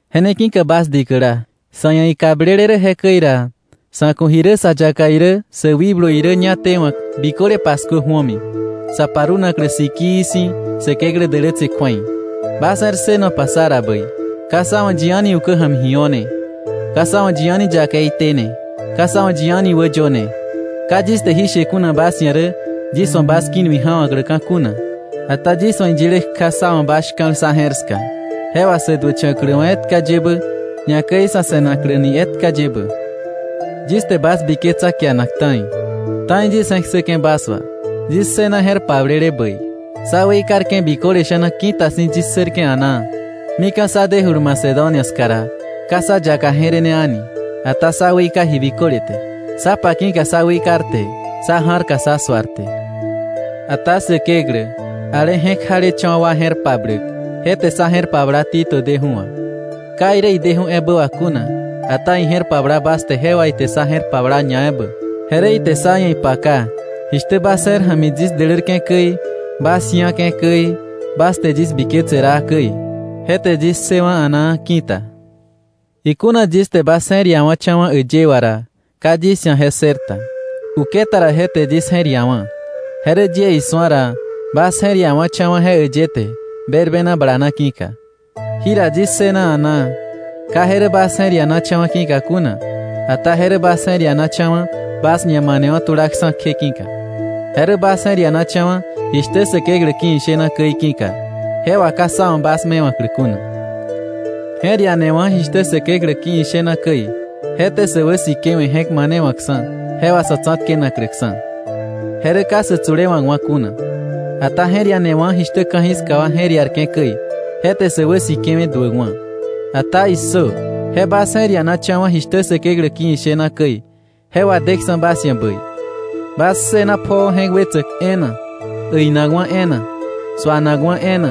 Je ne ki̱ka bas dikäla, sa̱ ia̱ ikablele rä jekäi ra, sa̱ ku̱ ji rä sa yaka irä sä wikblu irä ñá tewa̱k biköle paskuö ju̱omi, sa parunaklä sikii si̱ Säkeklä dälätse kju̱ei. Bas je̱r ssënopa sá ra bäi. Ka sá wa̱ yi a̱ni ukä ja̱mi ji o̱ne, ka sá wa̱ yi a̱ni yakei tene, ka sá wa̱ yi a̱ni wäyöne. Ka yis te jí she kuna bas ia̱ rä yis wa̱ bas ki̱ nui ja̱wa̱kläka̱ kuna, ata yis wa̱ iyile kja sá wa̱ bas shka̱l sá je̱r ska, je wà sä duächa̱kläwa̱ etka yebä, ñakäi sa̱ se̱nakläni etka yebä. Yis te bas biketsa kianak ta̱i. Ta̱i yis je̱k ssäke̱ bas wà. Yis ssëna je̱r pablele bäi. Sá weikarke̱ biköle sha̱na ki̱ta si̱ yis ssërke̱ a̱naa. Mika̱ sá dejulu Macedonia ska ra, ka sá yaka je̱rene a̱ni, ata sá weika ji biköle te, sá pa ki̱ka sá weikarte, sá ja̱rka sa suarte. Ata Säkeklä, ale je̱k jalecha̱wa̱ wa je̱r pabläk, je te sá je̱r pabla Tito deju̱ wà, ka irä ideju̱ ebä wà kuna, ata ije̱r pabla bas te je wà ite sá je̱r pabla ñaebä. Je rä ite sá ia̱ ipaka jishtä bas je̱r ja̱mi yis dälärke̱ käi, bas ji̱ake̱ käi, bas te yis biketse raa käi. Je te yis ssëwa̱ a̱naa ki̱ta. Ikuna yis te bas je̱r iawa̱cha̱wa̱ äyë wà ra, ka yis ia̱ je ssërta. Uketa ra je te yis je̱r iawa̱, je rä yie isu̱a ra bas je̱r ia̱wa̱cha̱wa̱ je äyë te berbena bala na ki̱ka. Jira yis ssëna a̱naa. Ka je rä bas je̱r ianacha̱wa̱ ki̱ka kuna, ata je rä bas je̱r ianacha̱wa̱ bas ñamanewa̱ tulaksa̱ kje ki̱ka, je rä bas je̱r ianacha̱wa̱ jishtä Säkeklä ki̱ ishena käi ki̱ka, je wà ka sá wa̱ bas mewa̱klä kuna. Je̱r ianewa̱ jishtä Säkeklä ki̱ ishena käi, je te sä wäsikewe̱ je̱k manewa̱ksa̱ je wà sa̱ tsa̱tkenakläksa̱. Je rä ka sä tsulewa̱kwa̱ kuna. Ata je̱r ianewa̱ jishtä ka̱jiska wa je̱r iarke̱ käi, je te sä wäsikewe̱ duäkwa̱. Ata ¡issö! Je bas je̱r ianacha̱wa̱ jishtä Säkeklä ki̱ ishena käi, je wadeksa̱ bas ia̱ bäi, bas ssëna pjoo je̱k wetsäk e̱e̱na, äinakwa̱ e̱e̱na, suanakwa̱ e̱e̱na,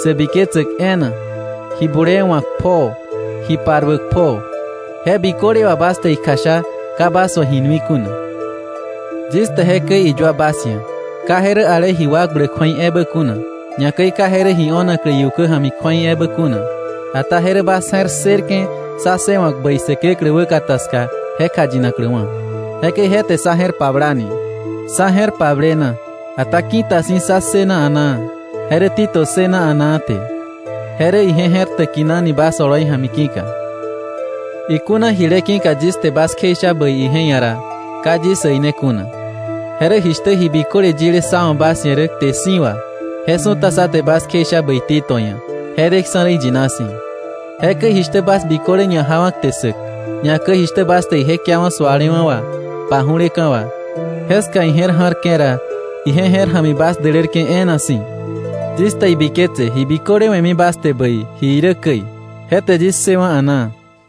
sä biketsäk e̱e̱na, ji bulee wa̱k pjoo, ji paruäk pjoo. Je biköle wà bas te ikjasha ka bas wa̱ ji nui kuna. Yis te jekäi iyua bas ia̱, ka je rä ale ji wakbläk kju̱ei ebä kuna, ñakäi ka je rä ji o̱na iukä ja̱mi kju̱ei ebä kuna, ata je rä bas je̱r ssërke̱ sá ssëwa̱k bäi Säkeklä wäkata ska je kjayinakläwa̱. Jekäi je te sá je̱r pablani. Sá je̱r pablena, ata ki̱ta si̱ sá ssëna a̱naa, je rä Tito ssëna a̱naa te. Je rä ije je̱r täkinani bas oloi ja̱mi ki̱ka. Ikuna jile ki̱ka yis te bas kjeisha bäi ije ia̱ ra, ka yis äine kuna. Je rä jishtä ji biköle yile sá wa̱ bas ia̱ rä kte si̱ wà, je su̱ta sá te bas kjeisha bäi Tito ia̱, je deksa̱ rä iyina si̱. Jekäi jishtä bas biköle ñajawa̱ kte sssäk, ñakäi jishtä bas te ije kiawa̱ sualewa̱ wà, paju̱leka̱ wà, jeska ije̱r ja̱rke̱ ra ije je̱r ja̱mi bas dälärke̱ e̱e̱na si̱. Yis te ibiketse ji biköle we̱mi bas te bäi, ji irä käi. Je te yis ssëwe̱ a̱naa.